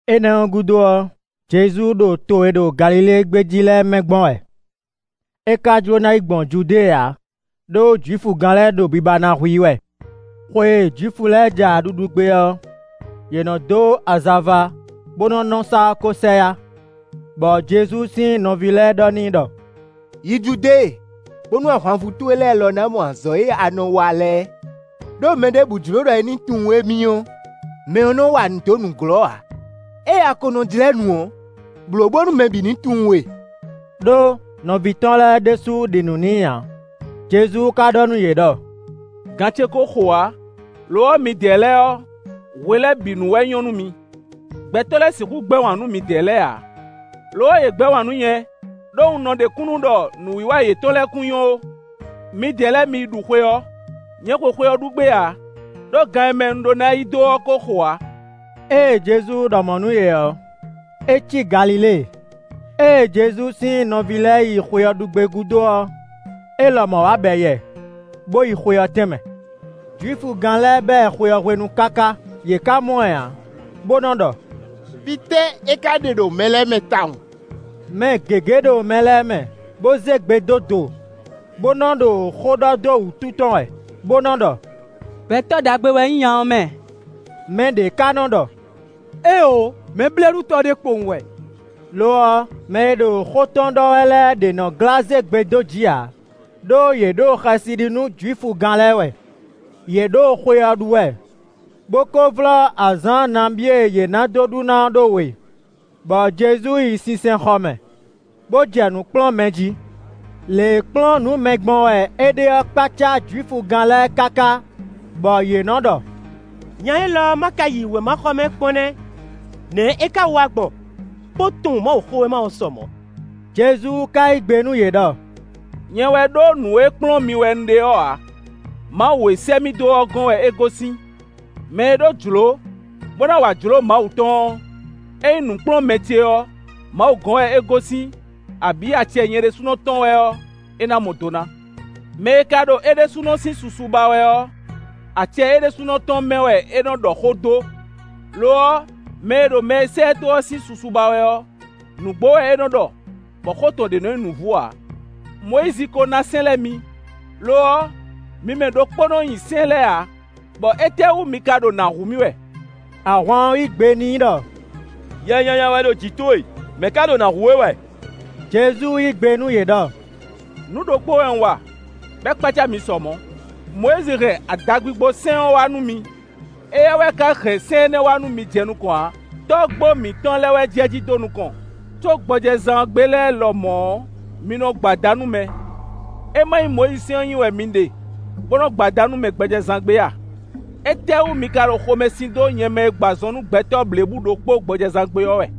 Énɛ́ ɔ́ gúdo ɔ́, Jezu ɖo to e ɖo Galilée gbé jí lɛ́ɛ mɛ gbɔn wɛ; é ka jló ná yi gbɔn Judée ǎ, ɖó Jwifugán lɛ́ɛ ɖo biba ná hu i wɛ. Xwe e Jwifu lɛ́ɛ ja ɖuɖu gbé ɔ́, yě nɔ dó azava bó nɔ́ nɔ sá ɔ́ ko sɛ yá. Bɔ Jezu sín nɔví lɛ́ɛ ɖɔ n'i ɖɔ: “Yi Judée, bónú ahwanvú towe lɛ́ɛ lɔ ná mɔ azɔ̌ e a nɔ wa lɛ́ɛ. Đó mɛ ɖěbǔ jló ɖɔ è nǐ tunwun émí ɔ́, mɛ ɔ́ nɔ́ wa nǔ dó nǔglɔ́ ǎ; ée a ko nɔ jlɛ́ nǔ ɔ́, blǒ bónú mɛ bǐ ní tunwun we.” Đó nɔví tɔn lɛ́ɛ ɖésú ɖi nǔ n'i ǎ. Jezu ka ɖɔ nú yě ɖɔ: “Gan ce ko xo ǎ; lo ɔ́, midɛɛ lɛ́ɛ ɔ́, hwe lɛ́ɛ bǐ nu wɛ nyɔ́ nú mi. Gbɛtɔ́ lɛ́ɛ sixú gbɛ́ wǎn nú midɛɛ lɛ́ɛ ǎ; lo ɔ́, yě gbɛ́ wǎn nú nyɛ, ɖó un nɔ ɖe kúnnu ɖɔ nǔwiwa yětɔn lɛ́ɛ kún nyɔ́ ó. Midɛɛ lɛ́ɛ mi yi ɖu xwe ɔ́; nyɛ xwe xwe ɔ́ ɖu gbé ǎ; ɖó gan e mɛ un ɖó ná yi dó ɔ́ ko xo ǎ.” Ée Jezu ɖɔ mɔ̌ nú yě ɔ́, é cí Galilée. Ée Jezu sín nɔví lɛ́ɛ yi xwe ɔ́ ɖu gbé gúdo ɔ́, é lɔmɔ̌ wá bɛ yɛ, bó yi xwe ɔ́ tɛn mɛ. Jwifugán lɛ́ɛ ba ɛ xwe ɔ́ hwenu káká, yě ká mɔ ɛ ǎ, bó nɔ́ ɖɔ: “Fítɛ́ é ka ɖe ɖo mɛ lɛ́ɛ mɛ tawun?” Mɛ gěgé ɖo mɛ lɛ́ɛ mɛ, bo zé gbe dó do, bo nɔ ɖo xó ɖɔ dó wútu tɔn wɛ, bó nɔ́ ɖɔ: “Gbɛtɔ́ ɖagbe wɛ nyí nya ɔ́ mɛ!” Mɛɖě ká nɔ ɖɔ: “Éeǒ; mɛblɛ́ɖutɔ́ ɖé kpowun wɛ.” Lo ɔ́, mɛ e ɖo xó tɔn ɖɔ wɛ lɛ́ɛ ɖě nɔ glá zé gbe dó jǐ ǎ, ɖó yě ɖo xɛsi ɖi nú Jwifugán lɛ́ɛ wɛ. Yě ɖo xwe ɔ́ ɖu wɛ, bó ko vlɔ́ azǎn nabí e yě ná dó ɖu ná ɔ́ ɖó we, bɔ Jezu yi sinsɛnxɔ mɛ, bó jɛ nǔ kplɔ́n mɛ jí. Lě e kplɔ́n nǔ mɛ gbɔn wɛ é ɖe ɔ́ kpácá Jwifugán lɛ́ɛ káká bɔ yě nɔ ɖɔ: “Nya élɔ́ má ka yi wěmaxɔmɛ kpɔ́n nɛ́! Nɛ̌ é ká wa gbɔn bó tunwun Mawuxówéma ɔ́ sɔ mɔ̌?” Jezu ka yí gbe nú yě ɖɔ: “Nyɛ wɛ ɖó nǔ e kplɔ́n mi wɛ un ɖe ɔ́ ǎ; Mawu e sɛ́ mì dó ɔ́ gɔ́n wɛ é gosín. Mɛ e ɖó jlǒ, bó ná wa jlǒ Mawu tɔn ɔ́, ényí nǔkplɔ́nmɛ ce ɔ́, Mawu gɔ́n wɛ é gosín abǐ acɛ nyɛ ɖésúnɔ tɔn wɛ ɔ́, é ná mɔ do ná. Mɛ e ka ɖo é ɖésúnɔ sín susu ba wɛ ɔ́, acɛ é ɖésúnɔ tɔn mɛ wɛ é nɔ ɖɔ xó dó. Lo ɔ́, mɛ e ɖo mɛ e sɛ́ ɛ dó ɔ́ sín susu ba wɛ ɔ́, nǔgbó wɛ é nɔ ɖɔ, bɔ xó tɔn ɖě nɔ́ nyí nǔvú ǎ. Mɔyízi ko ná sɛ́n lɛ́ɛ mi; lo ɔ́, mi mɛ ɖokpó nɔ́ nyi sɛ́n lɛ́ɛ ǎ; bɔ étɛ́ wú mi ka ɖo nǎ hu mì wɛ?” Ahwan ɔ́ yí gbe n'i ɖɔ: “Yɛ nyanya wɛ ɖo jǐ towe; mɛ̌ ká ɖo nǎ hu we wɛ?” Jezu yí gbe nú yě ɖɔ: “Nǔ ɖokpó wɛ un wa, bɔ é kpácá mi sɔ mɔ̌. Mɔyízi hɛn adagbigbo sɛ́n ɔ́ wá nú mi; (é wɛ ka jɛ sɛ́n énɛ́ nyi jí jɛ nukɔn ǎ, tɔ́gbó mǐtɔn lɛ́ɛ wɛ jɛ jí dó nukɔn), có gbɔjɛzán gbe lɛ́ɛ lɔmɔ̌ ɔ́, mi nɔ gbo ada nú mɛ. É ma nyí Mɔyízisɛ́n ɔ́ nyi wɛ mi ɖe bó nɔ́ gbo ada nú mɛ gbɔjɛzán gbe a? Étɛ́wú mi ka ɖo xomɛ sin dó nyɛ mɛ e gbɔ azɔn nú gbɛtɔ́ blěbǔ ɖokpó gbɔjɛzán gbe ɔ́ wɛ.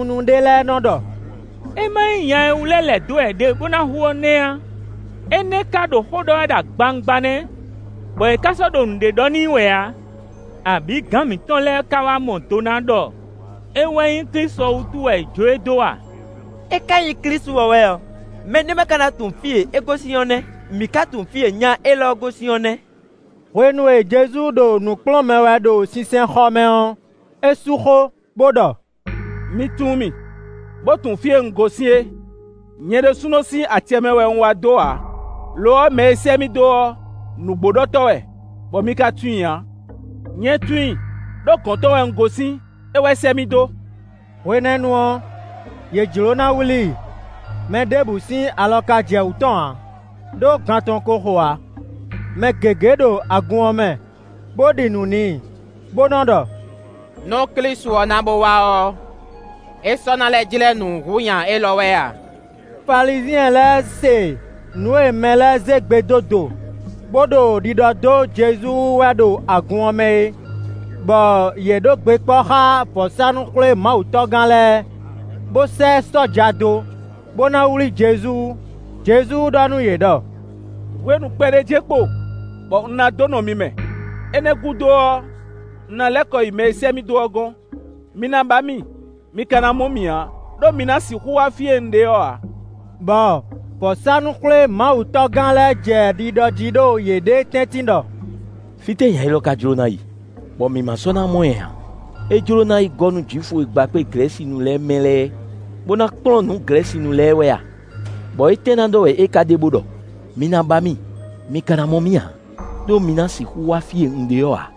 Jeluzalɛ́munu ɖé lɛ́ɛ nɔ ɖɔ: “É ma nyí nya e wú lɛ́ lɛ̌ dó wɛ yě ɖe bo na hu ɔ́ nɛ́ a? É nɛ́ ka ɖo xó ɖɔ wɛ ɖo agbawungba nɛ́; bɔ yě ká sɔ́ ɖo nǔɖé ɖɔ n'i wɛ ǎ; abǐ gǎn mǐtɔn lɛ́ɛ ka wá mɔ do na ɖɔ é wɛ nyí Klísu ɔ́ wútu wɛ è jó e dó a? É ka nyí Klísu ɔ́ wɛ ɔ́, mɛɖé ma ka na tunwun fí e é gosín ɔ́ nɛ́? Mǐ ká tunwun fí e nya élɔ́ gosín ɔ́ nɛ́!” Hwenu e Jezu ɖo nǔ kplɔ́n mɛ wɛ ɖo sinsɛnxɔ mɛ ɔ́, é sú xó, bó ɖɔ: “Mi tunwun mì, bó tunwun fí e un gosín é. Nyɛ ɖésúnɔ sín acɛ mɛ wɛ un wá dó ǎ, lo ɔ́, mɛ e sɛ́ mì dó ɔ́, nǔgbóɖɔtɔ́ wɛ, bɔ mi ka tunwun i ǎ. Nyɛ tunwun i, ɖó gɔ̌n tɔn wɛ un gosín; é wɛ sɛ́ mì dó.” Hwenɛ́nu ɔ́, yě jló ná wlí i, mɛ ɖěbǔ sín alɔ ka jɛ wú tɔn ǎ, ɖó gan tɔn ko xo ǎ. Mɛ gěgé ɖo agun ɔ́ mɛ bó ɖi nǔ n'i, bó nɔ́ ɖɔ: “Nú Klísu ɔ́ na bo wá ɔ́, é sɔ́ ná lɛ́ jlɛ́ nǔ hú nya élɔ́ wɛ a?” Falizyɛn lɛ́ɛ se nǔ e mɛ lɛ́ɛ zé gbe dó do, bó ɖo ɖiɖɔ dó Jezu wú wɛ ɖo agun ɔ́ mɛ é, bɔ yě ɖó gbe kpɔ́ xá vɔ̌sánú-xwlémawutɔ́gán lɛ́ɛ, bó sɛ́ sɔ́ja dó, bó ná wlí Jezu. Jezu ɖɔ nú yě ɖɔ: “Hwenu kpɛɖé jɛ́n kpo, bɔ un ná dó nɔ mi mɛ; énɛ́ ɔ́ gúdo ɔ́, un na lɛ́ kɔ yi mɛ e sɛ́ mì dó ɔ́ gɔ́n. Mi ná ba mì, mi ka ná mɔ mì ǎ; ɖó mi ná sixú wá fí e un ɖe ɔ́ ǎ.” Bɔ vɔ̌sánú-xwlémawutɔ́gán lɛ́ɛ jɛ ɖiɖɔ jí ɖo yěɖée tɛ́ntin ɖɔ: “Fítɛ́ nya élɔ́ ka jló ná yi, bɔ mǐ ma sɔ́ ná mɔ ɛ ǎ? É jló ná yi gɔ́ nú Jwifu e gba kpé Glɛ̌sinu lɛ́ɛ mɛ lɛ́ɛ, bó ná kplɔ́n nǔ Glɛ̌sinu lɛ́ɛ wɛ a? Bɔ étɛ́ ná ɖɔ wɛ é ka ɖe bó ɖɔ: ‘Mi ná ba mì, mi ka ná mɔ mì ǎ, ɖó mi ná sixú wá fí e un ɖe ɔ́ ǎ.’”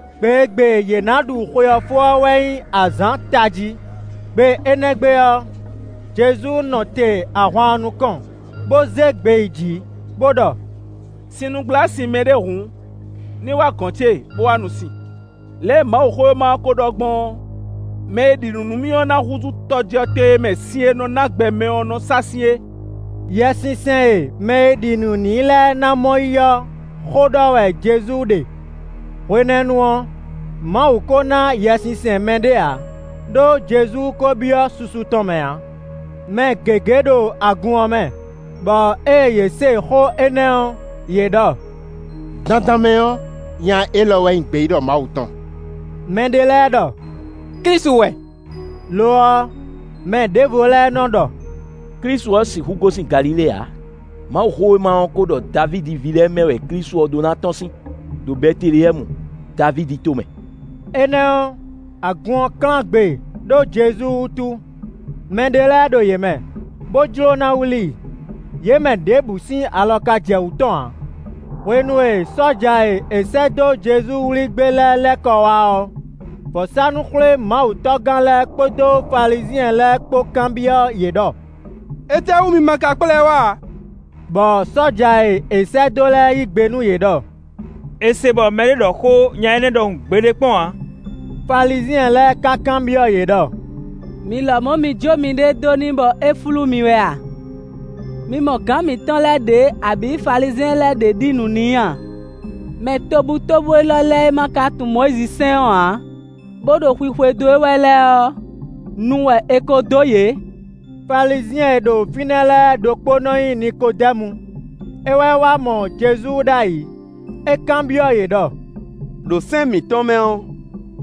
Gbe e gbe yě ná ɖu xwe ɔ́ fó ɔ́ wɛ nyí azǎn tají. Gbe énɛ́ gbe ɔ́, Jezu nɔ te ahwan ɔ́ nukɔn, bó zé gbe yi jǐ bó ɖɔ: “Sinnugblá sin mɛɖé hǔn, ní wá gɔ̌n ce bó wá nu sin. Lě e Mawuxówéma ɔ́ ko ɖɔ gbɔn ɔ́, mɛ e ɖi nǔ nú mì ɔ́, ná húzú tɔjɔtɛn e mɛ sin e nɔ ná gbɛ mɛ ɔ́ nɔ sa sín é.” Yɛsinsɛn e mɛ e ɖi nǔ n'i lɛ́ɛ ná mɔ yí ɔ́ xó ɖɔ wɛ Jezu ɖe. Hwenɛ́nu ɔ́, Mawu ko na Yɛsinsɛn mɛɖé ǎ; ɖó Jezu ko byɔ́ susu tɔn mɛ ǎ. Mɛ gěgé ɖo agun ɔ́ mɛ, bɔ ée yě se xó énɛ́ ɔ́, yě ɖɔ: “Dandan mɛ ɔ́, nya élɔ́ wɛ nyí gbeyíɖɔ Mawu tɔn.” Mɛ ɖé lɛ́ɛ ɖɔ: “Klísu wɛ;” lo ɔ́, mɛ ɖěvo lɛ́ɛ nɔ ɖɔ: “Klísu ɔ́ sixú gosín Galilée ǎ. Mawuxówéma ɔ́ ko ɖɔ Davídi ví lɛ́ɛ mɛ wɛ Klísu ɔ́ ɖó ná tɔ́n sín, ɖo Bɛteleyɛ́mu, Davídi tomɛ.” Énɛ́ ɔ́, agun ɔ́ klán gbe ɖó Jezu wútu. Mɛ ɖé lɛ́ɛ ɖo yě mɛ, bo jló ná wlí i; yě mɛ ɖěbǔ sín alɔ ka jɛ wǔ tɔn ǎ. Hwenu sɔ́ja e è sɛ́ dó Jezu wlí gbé lɛ́ɛ lɛ́ kɔ wá ɔ́, vɔ̌sánú-xwlémawutɔ́gán lɛ́ɛ kpódó Falizyɛn lɛ́ɛ kpó kanbyɔ́ yě ɖɔ: “Étɛ́wú mi ma ka kplá ɛ wá ǎ?” Bɔ sɔ́ja e è sɛ́ dó lɛ́ɛ yí gbe nú yě ɖɔ: “È se bɔ mɛɖé ɖɔ xó nya énɛ́ ɖɔhun gbeɖé kpɔ́n ǎ.” Falizyɛn lɛ́ɛ ka kanbyɔ́ yě ɖɔ: “Mi lɔmɔ̌ mi jó miɖée dó n'i bɔ é flú mi wɛ a? Mi mɔ gǎn mǐtɔn lɛ́ɛ ɖě abǐ Falizyɛn lɛ́ɛ ɖě ɖi nǔ n'i a? Mɛ tobutóbú élɔ́ lɛ́ɛ e ma ka tunwun Mɔyízi sɛ́n ɔ́ ǎ, bo ɖo xwixwedó e wɛ lɛ́ɛ ɔ́, nu wɛ è ko dó yě.” Falizyɛn e ɖo fínɛ́ lɛ́ɛ ɖokpó nɔ nyí Nikodɛ́mu; é wɛ wá mɔ Jezu ɖ'ayǐ; é kanbyɔ́ yě ɖɔ: “Đo sɛ́n mǐtɔn mɛ ɔ́,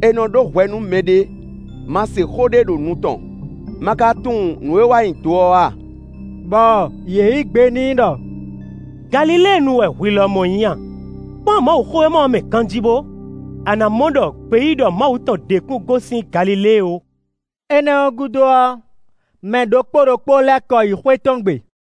e nɔ ɖó hwɛ nú mɛɖé má se xó ɖé ɖo nu tɔn, ma ka tunwun nǔ e é wa nyi do ɔ́ a?” Bɔ yě yí gbe n'i ɖɔ: “Galiléenu wɛ hwi lɔmɔ̌ nyí a? Kpɔ́n Mawuxówéma ɔ́ mɛ ganjí bo! A ná mɔ ɖɔ gbeyíɖɔ Mawu tɔn ɖě kún gosín Galilée ó.” Nyɔ̌nu ɖé dó afɔ gbě [ Énɛ́ ɔ́ gúdo ɔ́, mɛ ɖokpó ɖokpó lɛ́ kɔ yi xwé tɔn gbe.